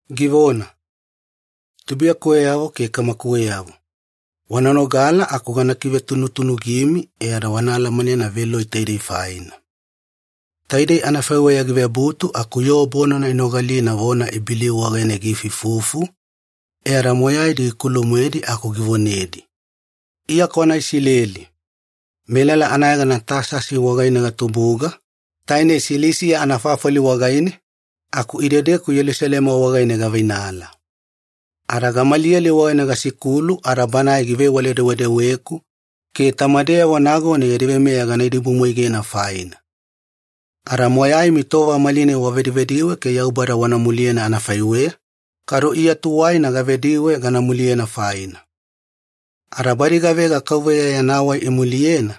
Givona, “Tubuiyakuweyavo ke kamakuweyavo, wana nogala aku gana kivetunutunugimi e ada wana alamanena veloi taidei faina.” Taidei anafaiweya givebutu aku yoo bonana inogalina vona Ibeliu wagaine giifuifufu, e ada moyaidi gikulu-moedi aku givonedi, “Iya kwana Isileli. Melala anayegana Tasasi wagaine gatubuga, tainei Silisiya anafafali wagaine, aku idedeku Yelusalema wagaine gaveinala. Ada Gamaliyeli wagaine gasikulu ada banae givewale-dewedeweku ke tamadeyavo nagona yadi veimeya gana idibumwaigena faina. Ada moyaimi tova malinai wavedivediwe ke Yaubada wana muliyena anafaiweya, kadu Iya tuwaina gavediwe gana muliyena faina. Ada badi gavega Kauveya Yana Wai imuliyena,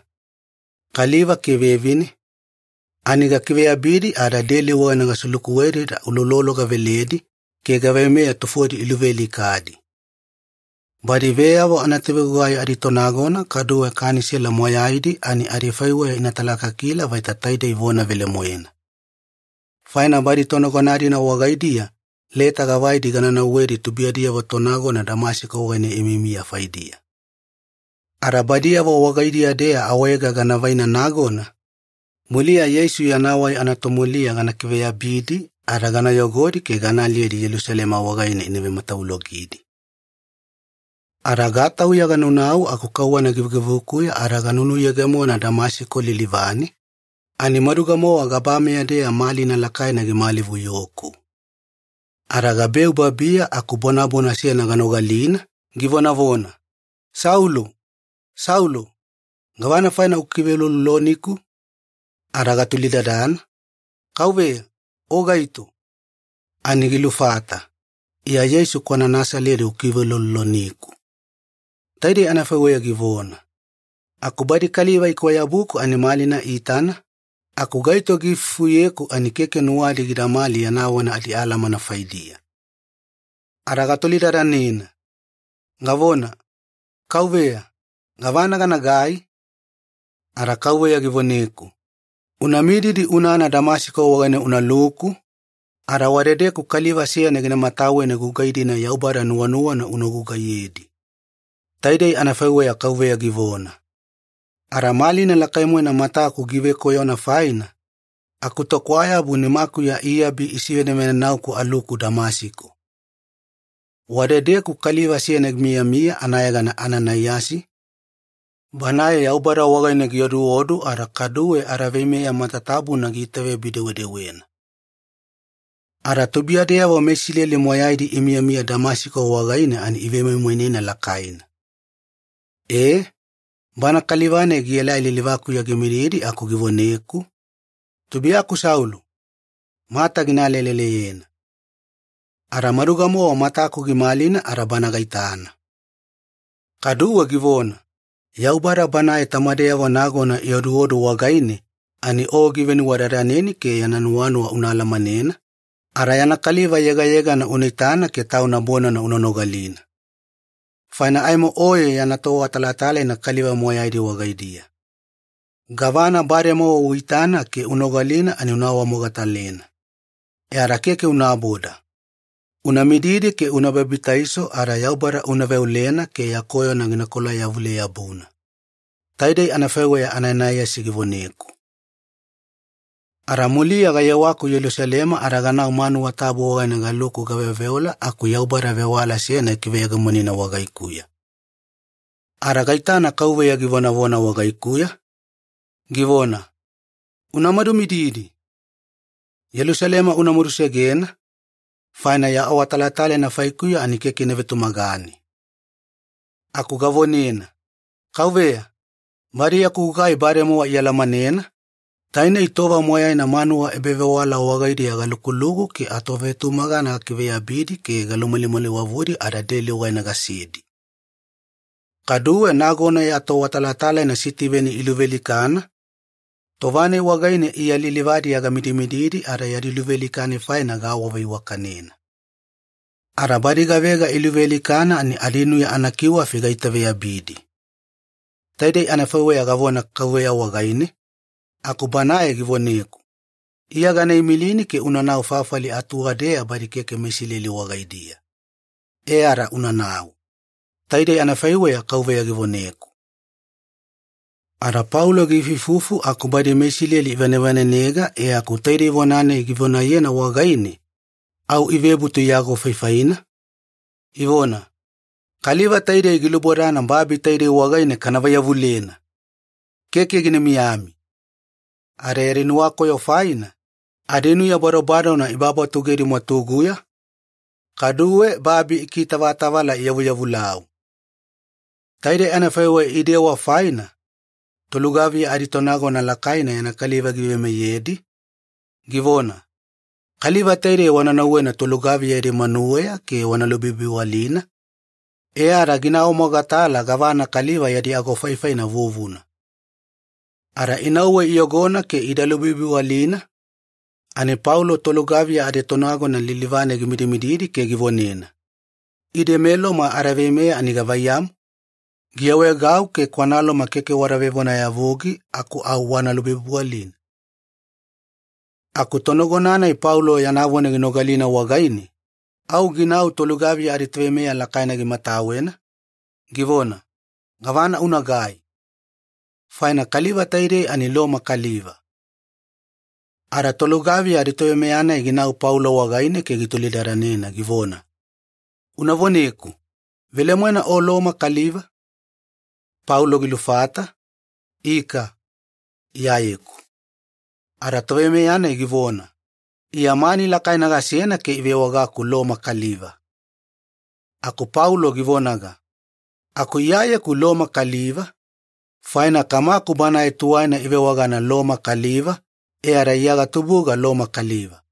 kaliva ke vevine, ani gakiveyabidi ada deli wagaine gaselukuwedi ada uloulolo gaveledi ke gaveimeya tufodi iluvealikadi. Badi veyavo anatovegugai aditonagona kaduwe Kanisela moyaidi ani adifaiweya ina talakakila vaita taidei vona velemoena. Faina badi tonagona-dina wagaidiya leta gavaidi gana nauwedi tubuiyadiyavo tonagona Damasiko wagaine imiyamiya faidiya. Ada badiyavo wagaidiya-deya awaega gana vaina nagona, muliya Yeisu yana Wai anatomuliya gana kiveyabidi ada gana yogodi ke gana aliyedi Yelusalema wagaine ina vematavulogidi. “Ada gatauya ganaunau aku kauwana givugivukuya ada ganunuyegemona Damasiko lilivane, ani maduga-mowa gabameya-deya malina lakaina gimalivuyoku. Ada gabeu babiya aku bonabona seyana ganogalina, givonavona, ‘Saulo! Saulo! Gavana faina ukiveulouloloniku?’ “Ada gatolidadana, ‘Kauveya, O gaito?’ “Ani gilufata, ‘Iya Yeisu kwana Nasaledi ukiveulouloloniku.’ Taidei anafaiweya givona. Aku badi kaliva ikwayabuku ani malina iitana, aku gaito giifufuyeku ani keke nuwadi gidamali yana vona adialamana faidiya. “Ada gatolidadanena, gavona, ‘Kauveya, gavana ganagai?’ “Ada Kauveya givoneku, ‘Una mididi unana Damasiko wagaine unaluku, ada wadedeku kaliva seyana gina mataweni gugai-dina Yaubada nuwanuwana una gugaiyedi.’ Taidei anafaiweya Kauveya givona. Ada malina lakai-moena mataku givekoyona faina, akutokwayabu nimakuya iabi isivenavenauku aluku Damasiko. “Wadedeku kaliva seyana gimiyamiya anayegana Ananaiyasi, banae Yaubada wagaine gioduodu ada kaduwe adaveimeya matatabuna giitaveyabi-dewedewena. Ada tubuiyadeyavo meIsileli moyaidi imiyamiya Damasiko wagaine ani ivemoimoinena lakaina. E, bana kaliva-nai gielai lilivakuya gimididi aku givoneku, ‘Tubuiyaku Saulo, mata gina aleleleyena.’ Ada maduga-mowa mataku gimalina ada bana gaitana. Kaduwe givona, ‘Yaubada Banae tamadeyavo nagona ioduodu wagaine ani o givenuwadadaneni ke yana nuwanuwa una alamanena, ada yana Kaliva Yegayegana una itana ke Tauna bonana una nogalina. Faina aimo oye yana toawatalatalaina kaliva moyaidi wagaidiya. Gavana bademowa uitana ke unogalina ani una awamogatalena. E ada keke unaboda. Una mididi ke una babitaiso ada Yaubada una veolena ke ya koyona gina kolayavule-yabuna.’ Taidei anafaiweya Ananaiyasi givoneku. “Ada muliya gayewaku Yelusalema ada ganau manuwa tabu wagaine galuku gaveoveola aku Yaubada vewala seyana gikiveyegemonina wagaikuya. Ada gaitana Kauveya givonavona wagaikuya, givona, ‘Una madumididi! Yelusalema una madusegena, faina ya awatalatalaina faikuya ani keke ina vetumagane.’ “Aku gavonena, ‘Kauveya, badi yaku gugai bademowa ialamanena, tainei tova moyaina manuwa ebavewala wagaidiya galukuluku ke atovetumagana gakiveyabidi ke galumalimaliwavudi ada deli wagaine gasedi. Kaduwe nagona ya toawatalatalaina Sitiveni iluvealikana, tova-nai wagaine Iya lilivadiya gamidimididi ada yadi luvealika-nai faina gaawaveiwakanena. Ada badi gavega iluvealikana ani adinuya anakiwafi gaitaveyabidi.’ Taidei anafaiweya gavona Kauveya wagaine aku Banae givoneku, ‘Iya gana imilini ke unanau fafali atuwadeya badi keke meIsileli wagaidiya. E ada unanau.’ Taidei anafaiweya Kauveya givoneku.” Ada Paulo giifuifufu aku badi meIsileli ivanevanenega e aku taidei vona-nai givonayena wagaine, au ivebutu iagofaifaina, ivona, “Kaliva taidei gilubodana babi taidei wagaine kana vaiyavulena! Keke gina miyami!” Ada yadi nuwakoyo faina, adinuya badobadona ibabatugedi mwatuguya, kaduwe babi ikikitavala iyavuyavulau. Taidei anafaiweya idewa faina, tolugaviya aditonagona lakaina yana kaliva giveimeyedi, givona, “Kaliva taidei wana nauwena tolugaviya yadi manuweya ke wana lubibiwalina, e ada gina awamogatala gavana kaliva yadi agofaifaina vuvuna.” Ada inauwe iyogona ke ida lubibiwalina, ani Paulo tolugaviya aditonagona lilivane gimidimididi ke givonena, “Ide meLoma adaveimeya ani gavaiyamu, giawaegau ke kwana Loma keke wada vevonayavugi aku au wana lubibiwalina?” Aku tonagona-nai Paulo yana vona ginogalina wagaine, au ginau tolugaviya aditoveimeya lakaina gimatawena, givona, “Gavana unagai? Faina kaliva taidei ani Loma kaliva.” Ada tolugaviya aditoveimeya-nai ginau Paulo wagaine ke gitolidadanena givona, “Una voneku, velemoena o Loma kaliva?” Paulo gilufata, “Ika, Iyayeku.” Ada toveimeya-nai givona, “Iya mani lakaina gasena ke ivewagaku Loma kaliva.” Aku Paulo givonaga, “Aku Iyayeku Loma kaliva, faina kamaku banae tuwaina ivewagana Loma kaliva e ada Iya gatubuga Loma kaliva.”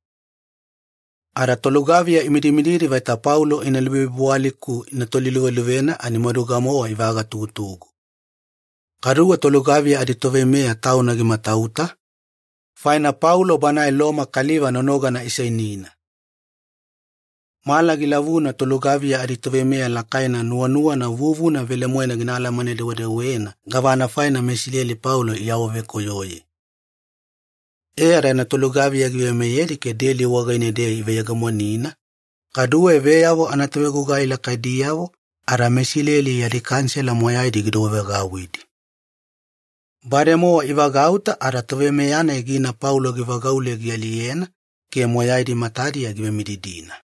Ada tolugaviya imidimididi vaita Paulo ina lubibiwali-ku ina toliluveluvena ani maduga-mowa ivagatugutugu. Kaduwe tolugaviya aditoveimeya tauna gimatauta, faina Paulo banae Loma kaliva nonogana iseinina. Mala gilavuna tolugaviya aditoveimeya lakaina nuwanuwana vuvuna velemoena gina alamane-dewedewena gavana faina meIsileli Paulo iawavekoyoye. E ada yana tolugaviya giveimeyedi ke deli wagaine-deya iveyegemonina, kaduwe veyavo anatovegugai lakaidiyavo ada meIsileli yadi Kanisela moyaidi gidouwevagauwidi. Bademowa ivagauta ada toveimeya-nai gina Paulo givagaule gialiyena ke moyaidi matadiya givemididina.